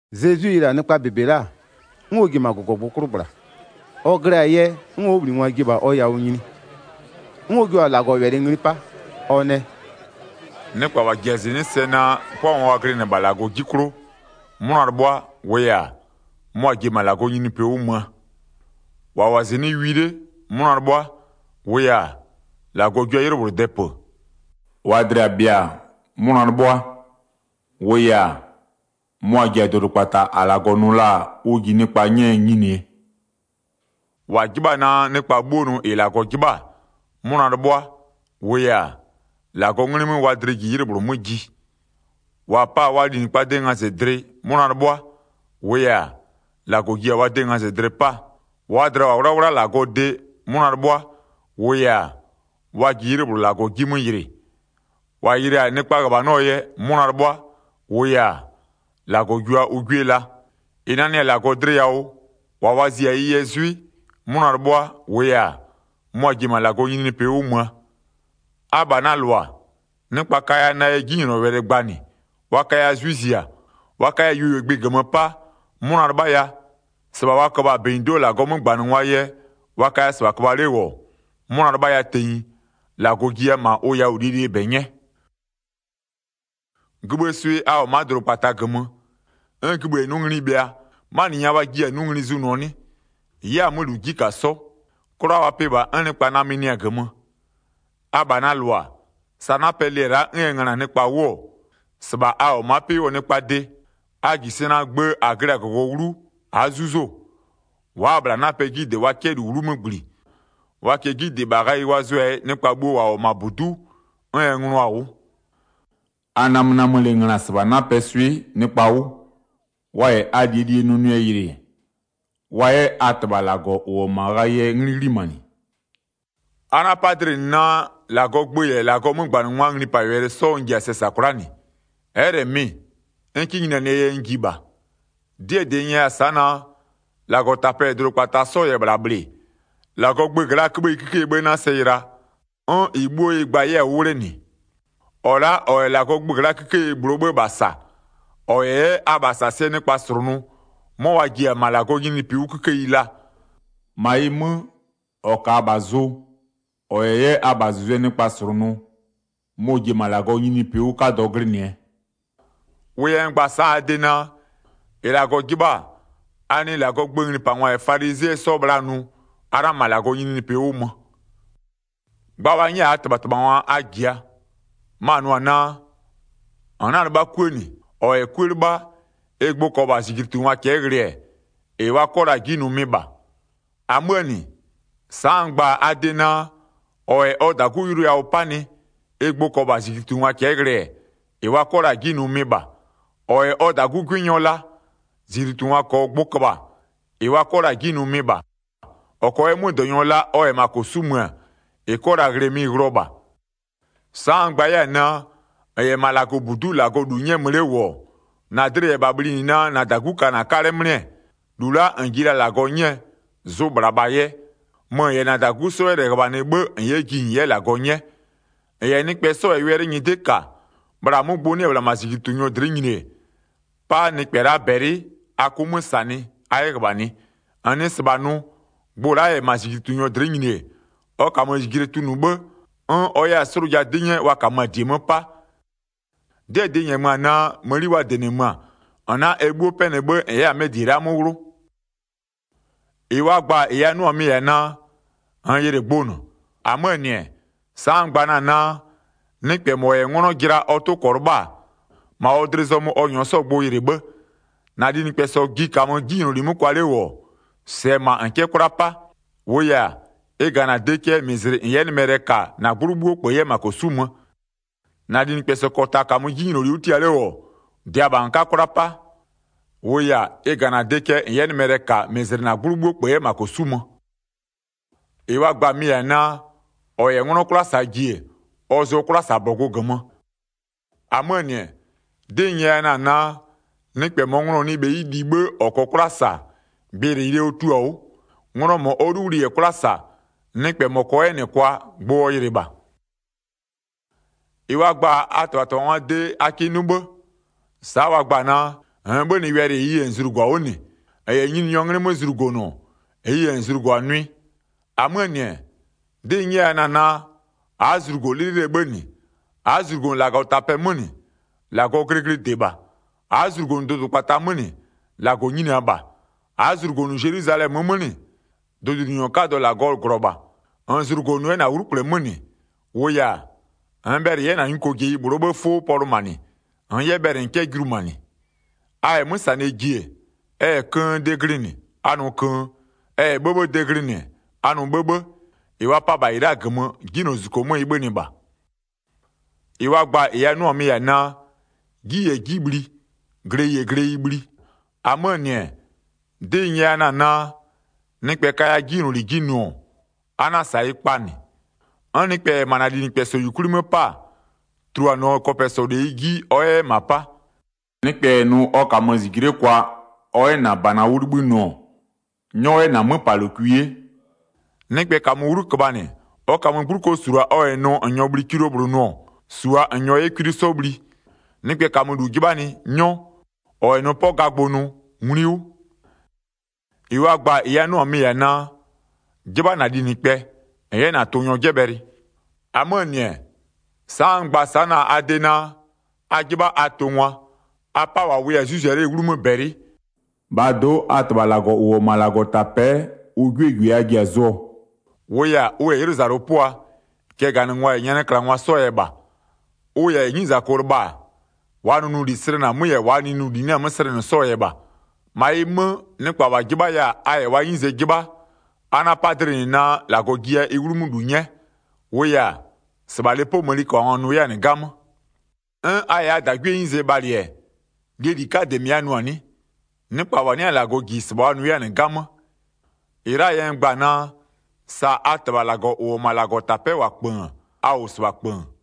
Zezwi yɩlɩ-a nɩkpa -bebe la'a, 'n ɔ ji-e -ma -gɔgɔgbʋ 'klʋ -gbla. Ɔ glɩ-a yɛ, 'n ɔ 'wʋbhlinɩngwa ji-e -bha ɔ yawʋ nyini. 'N ɔ jua-a -Lagɔwɛlɩ ngli 'pa, ɔ nɛ: “Nɩkpa -wa ji-a sɛ naa 'pʋangwa wa glɩnɩ-ɛ -bha -Lagɔ 'ji 'klʋ, 'mʋna 'lɩbhʋa, -wʋʋ yɛ-a, mʋa-a ji-e -ma -Lagɔɔ nyininyinipɩ 'wʋ möö. 4-Wa -wʋ-a -zɩnɩ'ɩ wi 'le, 'mʋna 'lɩbhʋa, -wʋʋ yɛ-a, -Lagɔ jua 'ylɩ -bhlʋ dɛpö. 5-Waa dlɩ-ɩ bhɩa-a, 'mʋna 'lɩbhʋa, -wʋʋ yɛ-a, mʋa-a ji-a dʋdʋkpata -a -Lagɔ nʋ la-a ʋ ji nɩkpa 'nyɛɛ nyinie. 6-Wa 'jɩbha-a naa nɩkpa 'bhuo nʋ -ɩ -Lagɔ 'jɩbha-a, 'mʋna 'lɩbhʋa, -wʋʋ yɛ-a, -Lagɔɔ 'nglɩ 'mö wa dlɩ ji 'ylɩ -bhlʋ 'mö ji. 7-Wa pa-a wa linɩkpaa de ngazɩdlɩ, 'mʋna 'lɩbhʋa, -wʋʋ yɛ-a, -Lagɔ ji-a wa de ngazɩdlɩ 'paa. 8-Waa dlɩa-a -wʋ-a 'wlawla -Lagɔɔ de, 'mʋna 'lɩbhʋa, -wʋʋ yɛ-a, wa ji 'ylɩ -bhlʋ -Lagɔ 'ji 'mö yɩlɩ. 9-Wa yɩlɩ-a nɩkpaa -ghöbhanɔ yɛ, 'mʋna 'lɩbhʋa, -wʋʋ yɛ-a, -Lagɔ jua ʋ 'gwie la. 10-Ɩ nanɩ-a -Lagɔ dlɩ yawʋ, -wa wa zia-a ɩ yɛ 'zwɩ, 'mʋna 'lɩbhʋa, -wʋʋ yɛ-a, mʋa-a ji-e -ma -Lagɔɔ nyininyinipɩ 'wʋ möö. 11Abha na -lʋa, nɩkpa kaya na yɛ 'jinylɔwɛlɩ gbanɩ wa kaya 'zwɩ zia, wa kaya yuoyuogbɩ -gömö 'pa, 'mʋna 'lɩbhaya. 12-Sɩbha wa köbha-a -bɛnyido'o -Lagɔɔ 'mögbanɩngwaa yɛ, wa kaya -sɩbha köbha 'le -wʋ, 'mʋna 'lɩbhaya tenyi, -Lagɔ jiya -ma ʋ yawʋ -lie -lie -bɛ 'nyɛ. Zezwi yɛ ɔ 'wʋbhlinɩngwa gïbhï -yɛ 'napɛ 'sɔ 'wʋ palɩ 13Gïbhïë swɩ a -wʋ-ɔ ma'a dʋdʋkpata -gömö. 'N gïbhï -yɛ 'nʋ ngli bhɩa, 'manɩ nya wa jiɩ-a 'nʋ ngli zʋnʋɔ 'nɩ? Ɩ'ɩ-a 'mö -lu 'ji -ka 'sɔ, 'kwla wa pɩ -bha 'n nɩkpa namönɩɩ-a -gömö. 14Abha na -lʋa, sa 'napɛ lɩ-ɛ la'a 'n ɛ ngöna-a nɩkpa 'wʋ-ɔ, -sɩbha a -wʋ-ɔ ma'a 'pɩ 'wʋɔ nɩkpaa de. A -ji sɛ naa gbë -a glɩ-a -gɔgɔ 'wlu a'a 'zuzo-o. 15Wa'a-a -bhla 'napɛ 'ji -dɩ wa 'kɛ -lu 'wlumö -gbli. Wa -kɛɛ 'ji -dɩ -bha ghayɩ wa zʋɛ-a yɛ nɩkpa bhuo -wa -wʋ-ɔ -ma -budu'u, 'n ɛ ngönʋa-a 'wʋ. 16A namönamölɩ ngöna -sɩbha 'napɛɛ swɩ'ɩ nɩkpa 'wʋ, wa -yɛ a -lie -lie nʋnʋlɩ yɩlɩ-ɛ, wa 'yɛ a -Tɩbha -Lagɔ -ʋ -wʋ-ɔ -ma ghayɩɛ 'nglɩ 'ghlimanɩ. Zezwi yɛ -Lagɔɔ gböö gbʋ gba 17A 'na-a 'pa dlɩ -nɩ naa -Lagɔɔ gbö -yɛ -Lagɔɔ 'mögbanɩngwa 'sɔɔ nglipawɛlɩ n ji-a sɛ -sa kwla'a -nɩ. Ɛ'ɛ -lɛ mɩ-ɩ, n 'kɩ nyinianɩɛ yɛ n ji -bha. 18'Dɩɛ -dɩ n nyɛya-a naa: -Lagɔtapɛ -yɛ dʋdʋkpata 'sɔ -yɛ -bhla -bhlɩ, -Lagɔɔ gböö gla'aa 'köbhëyi 'kikeyie 'bhë 'na sɛ yɩla 'n -ɩ 'bhuo ɩ gba-a 'yɛ-a 'wʋ 'wlenɩ. 19-Ɔ la'a -ɔ -yɛ -Lagɔɔ gbö gla'aa 'kikeyi -bhlʋɔ 'bhë -bha -sa, ɔ -yɛ 'yɛ a -bhasasɩɛ nɩkpa -slʋnʋ, 'mɔ wa ji-a -ma -Lagɔɔ nyininyinipɩ 'wʋ 'kikeyi laa. -Ma ɩ 'mö, -ɔ -kaa -bha zʋ, -ɔ -yɛ 'yɛ a -bhazʋzʋɛ nɩkpa -slʋnʋ, mɔ-ɔ ji-e -ma -Lagɔɔ nyininyinipɩ 'wʋ 'kadɔ glɩnɩɛ. 20Wʋ yɛ n gba-a sa'a a de naa: -Ɩ -Lagɔ 'jɩbha-a, a nɩɩ -Lagɔɔ gböö nglipangwa -yɛ falizɩɛ 'sɔɔ bhla nʋ, a 'na -ma -Lagɔɔ nyininyinipɩ 'wʋ mö. Zezwi yɛ yʋlʋɔ gbʋ gba 21Gba wa 'nyɛ-a -aa -tɩbhatɩbhangwa a -jia, ma-a nʋ-ɔ naa: -N 'na-a 'lɩbha 'kuë -nɩ, -ɔ -yɛ 'kuë 'lɩbha, ɩ gbʋ -kɔɔ -bha -zijlitungwa cɛ'ɛ ghlɩ-ɛ, -ɩ wa 'kɔ la-a 'ji nʋ mɩ -bha. 22-Amöö -nɩ-ɛ, sa'a n gba-a a de naa, -ɔ -yɛ ɔ -dagu yʋlʋ yawʋ 'panɩ ɩ gbʋ -kɔɔ -bha -zijlitungwa cɛ'ɛ ghlɩ-ɛ, -ɩ wa 'kɔ la-a 'ji nʋ mɩ-ɩ -bha. -Ɔ -yɛ ɔ -dagu 'gwɩnyɔ la, -zijlitungwa -kɔɔ gbʋ köbha, -ɩ wa 'kɔ la-a 'ji nʋ mɩ -bha. Ɔ -kɔɔ 'yɛ 'mödɔnyɔ la, ɔ -yɛ -ma -kosu'u mö-ö, -ɩ 'kɔ la-a ghlɩ mɩ-ɩ ghlɩɔ -bha. 23Sa'a n gba 'yɛ-a naa: -N -yɛ -ma -Lagɔbudu'u -Lagɔ -lu 'nyɛɛ mö 'le -wʋ-ɔ, -na dlɩ -yɛ -bha bhlinɩ naa -na -dagu ka na 'kalɛ 'mlɩ-ɛ, 24-lu la'a -n ji la-a -Lagɔ 'nyɛɛ, zʋʋ -bhla -bha yɛ, mö -n -yɛ -na -dagu 'sɔ 'yɛ -lɛ -ghöbhanɩ 'bhë -n 'yɛ ji -n 'yɛ -Lagɔ 'nyɛ. 25-N -yɛ nɩkpɛ 'sɔ -yɛ wɛlɩ nyɩdɩ'ɩ -ka, bhla 'mʋ gbʋ 'nɩ-ɛ -bhla -ma -zijlitunyɔ dlɩ'ɩ nyini-e, 'pa nɩkpɛ la'a -bɛlɩ a 'kʋ 'mö -sanɩ a 'yɛ -ghöbhanɩ. -N nɩ -sɩbha nʋ, gbʋ la'a -yɛ -ma -zijlitunyɔ dlɩ'ɩ nyini-e, ɔ -kamö -zijle tunʋ 'bhë, 'n ɔ 'yɛ-a 'slʋja 'dɩ 'nyɛ wa -kamö-a -die 'mö 'pa. 26'Dɩɛ -dɩ n -nyɛmö-a naa, mëni wa -dɩnɩmö-a, -n 'na ɛ 'bhuo 'pɛnɩ 'bhë -n 'yɛ-a 'mɛ -die la'a 'mö 'wlʋ. Zezwi yɛ gbʋyɩlɩyɩlɩɛɛ gbʋ gba 27-Ɩ wa gba-a -ɩ a nʋ-a mɩ-ɩ -yɛ-a naa: -Nn yɩlɩ gbʋ -nɩ. 28-Amöö -nɩ-ɛ, sa'a n gba na-a naa: Nɩkpɛ -mɔ -yɛ 'nglɔ jɩla ɔ 'tʋ -kɔɔ 'lɩbha, -ma ɔ dlɩ zɔmö ɔ -nyɔɔ 'sɔ yɛ gbʋ yɩlɩ 'bhë. 29-Na linɩkpɛsɔ ji -kamö 'jinyloli 'mö kwa 'le -wʋ-ɔ, -sɛɛ -ma -n 'kɛ 'kwla 'pa. -Wʋʋ yɛ-a, ɩ -ga na de cɛ -n 'yɛ nɩmɛlɛ -ka -mɩzlɩ -na 'gblʋ 'bhuo -kpö 'yɛ -ma -kosu'u mö. 30-Na linɩkpɛsɔ -kɔta -kamö 'jinyloli 'wʋ tia 'le -wʋ-ɔ, -dɩa -bha -n 'ka 'kwla 'pa. -Wʋʋ yɛ-a, ɩ -ga -na de cɛ -n 'yɛ nɩmɛlɛ -ka -mɩzlɩ -na 'gblʋ 'bhuo -kpö 'yɛ -ma -kosu'u mö. Zezwi yɛ 'nglɔɔ 'kwlasagbʋ gba 31Ɩ wa gba-a mɩ-ɩ -yɛ-a naa: -Ɔ -yɛ 'nglɔ 'kwla -saa ji-e, ɔ zʋɔ 'kwlasabɔgʋ -gömö. 32-Amöö -nɩ-ɛ, 'dɩ n nyɛya-a naa: Nɩkpɛ -mɔɔ nglɔ-ɔ nɩ bheyi li 'bhë ɔ -kɔɔ 'kwla -sa, gbɩyɩlɩyɩlɩɛ ɔ tio-a 'wʋ. Nglɔ -mɔ ɔ 'luwli -yɛ 'kwla -sa, nɩkpɛ -mɔ -kɔɔ 'yɛ -nɩ kwa, gbʋ ɔ yɩlɩ -bha. Zezwi yɛ zlugozlugwiee gbʋ gba 33-Ɩ wa gba-a a -tɩbhatɩbhangwaa de a kɩ 'nʋ 'bhë. Sa'a wa gba-a naa: -Nn 'bhönɩ wɛlɩ -ɩɩ yɛ -n zlugo-a 'wʋ -nɩ, -n -yɛ Nyininyɔɔ 'nglɩ 'mö zlugonʋ, -ɩɩ yɛ -n zlugo-a nʋɩ. 34-Amöö -nɩ-ɛ, 'dɩ n nyɛya na-a naa, a'a zlugo 'lɩlɩlɩɛ 'bhë -nɩ, a'a zlugonʋ -Lagɔtapɛ 'mö -nɩ, -Lagɔɔ glɩglɩde -bha. 35A'a zlugonʋ dʋdʋkpata 'mö -nɩ, -Lagɔ nyinia -bha. A'a zlugonʋ Zelwizalɛmö 'mö -nɩ, dʋdʋnyininyɔ 'kadɔ -Lagɔɔ -glɔ -bha. 36-Nn zlugonʋ 'yɛ -na 'wlukple 'mö -nɩ, -wʋʋ yɛ-a, -nn bhɛlɩ -n 'yɛ -na nyukojeyi -bhlʋɔ 'bhëë 'fʋ pɔlʋmanɩ, -nn 'yɛ bhɛlɩ -n 'kɛ julumanɩ. 37A -yɛ 'mö -sanɩɛ ji-e, ɛ -yɛ köön de glɩnɩ, a nʋ köön, ɛ -yɛ 'bhëbhëë de glɩnɩ-ɛ, a nʋ 'bhëbhë. -Ɩ wa pa-a -bha -ɩ la'a -gömö, 'Jinylozuzuko 'mö ɩ 'bhönɩ -bha. Zezwi yɛ kpasagbʋ gba 38-Ɩ wa gba-a -ɩ a 'nʋ-a mɩ-ɩ -yɛ-a naa: 'Ji -yɛ 'ji bhli, gleyi -yɛ gleyi bhli. 39-Amöö -nɩ-ɛ, 'dɩ n nyɛya na-a naa: Nɩkpɛ kaya 'jinyloli 'ji nʋ-ɔ, a 'na-a -sa ɩ kpa -nɩ. 'N nɩkpɛ -yɛ -ma -na linɩkpɛsɔ -yukwli 'mö 'pa, tuluanɩɔ kɔpɛsɔ -leyi 'ji ɔ 'yɛ 'yɛ -ma 'pa. 40Nɩkpɛ -yɛ nʋ ɔ -kamö -zijle'e kwa ɔ 'yɛ -na -bana 'wʋ 'libhï nʋ-ɔ, 'nyɔ 'yɛ -na 'möpalokwi 'ye. 41Nɩkpɛ -kamö 'wlu köbhanɩ, ɔ -kamö 'gbluko -sulua ɔ -yɛ nʋ -n -nyɔɔ bhli kilo -bhlʋ nʋ-ɔ, -sua -n -nyɔɔ 'yɛ kwli 'sɔ bhli. 42Nɩkpɛ -kamö -lu 'jɩbhanɩ, 'nyɔ. -Ɔ -yɛ nʋ 'pɔ gagbʋ nʋ, nglui 'wʋ. Zezwi nɛ naa: A 'jɩbha a tʋngwa 43-Ɩ wa gba-a -ɩ a 'nʋ-a mɩ-ɩ -yɛ-a naa: 'Jɩbha -na linɩkpɛ -n 'yɛ -na tʋnyɔ 'jɛbhɛlɩ. 44-Amöö -nɩ-ɛ, sa'a n gba na-a a de naa: A 'jɩbha a tʋngwa. A 'pa -wa wʋya-a 'zwɩ zia 'lee 'wlumö -Lagɔ -bɛlɩ. 45-Bhaa do'o, a -Tɩbha -Lagɔ -ʋ -wʋ-ɔ -ma -Lagɔtapɛ'ɛ ʋ 'gwiee -gwie a ji-a zʋɔ. -Wʋʋ yɛ-a, ʋ -yɛ 'ylʋzalʋ 'pʋa, cɛganɩngwa -yɛ nyanɩklangwa 'sɔɔ yɛ -bha. Ʋ -yɛ 'nyizako lɩbha-a, -waa nʋnʋli slɛnɩ-a 'mö -yɛ -waa -li 'nɩ-a 'mö slɛnɩ 'sɔɔ yɛ -bha. 46-Ma ɩ 'mö, nɩkpa -wa 'jɩbhaya-a a -yɛ wa 'nyize 'jɩbha, a 'na-a 'pa dlɩ -nɩ naa, -Lagɔ jiya ɩ 'wlumö -lu 'nyɛ. -Wʋʋ yɛ-a, -sɩbha lepoo mëniköbhangwa nʋ 'yɛ-a -nɩ 'gamö. 47'N a -yɛ a -dagwiee 'nyize bhalɩ-ɛ, -lie -li 'kadɩɛ -mɩ a nʋ-a 'nɩ? Nɩkpa -wa 'nɩ-a -Lagɔ -ji -sɩbha wa nʋ 'yɛ-a -nɩ 'gamö. 48-Ɩ la'aa yɛ n gba-a naa: Sa a -Tɩbha -Lagɔ -ʋ -wʋ-ɔ -ma -Lagɔtapɛ'ɛ -wʋ-a -kpöön, a -wʋ -sɩbha -kpöön.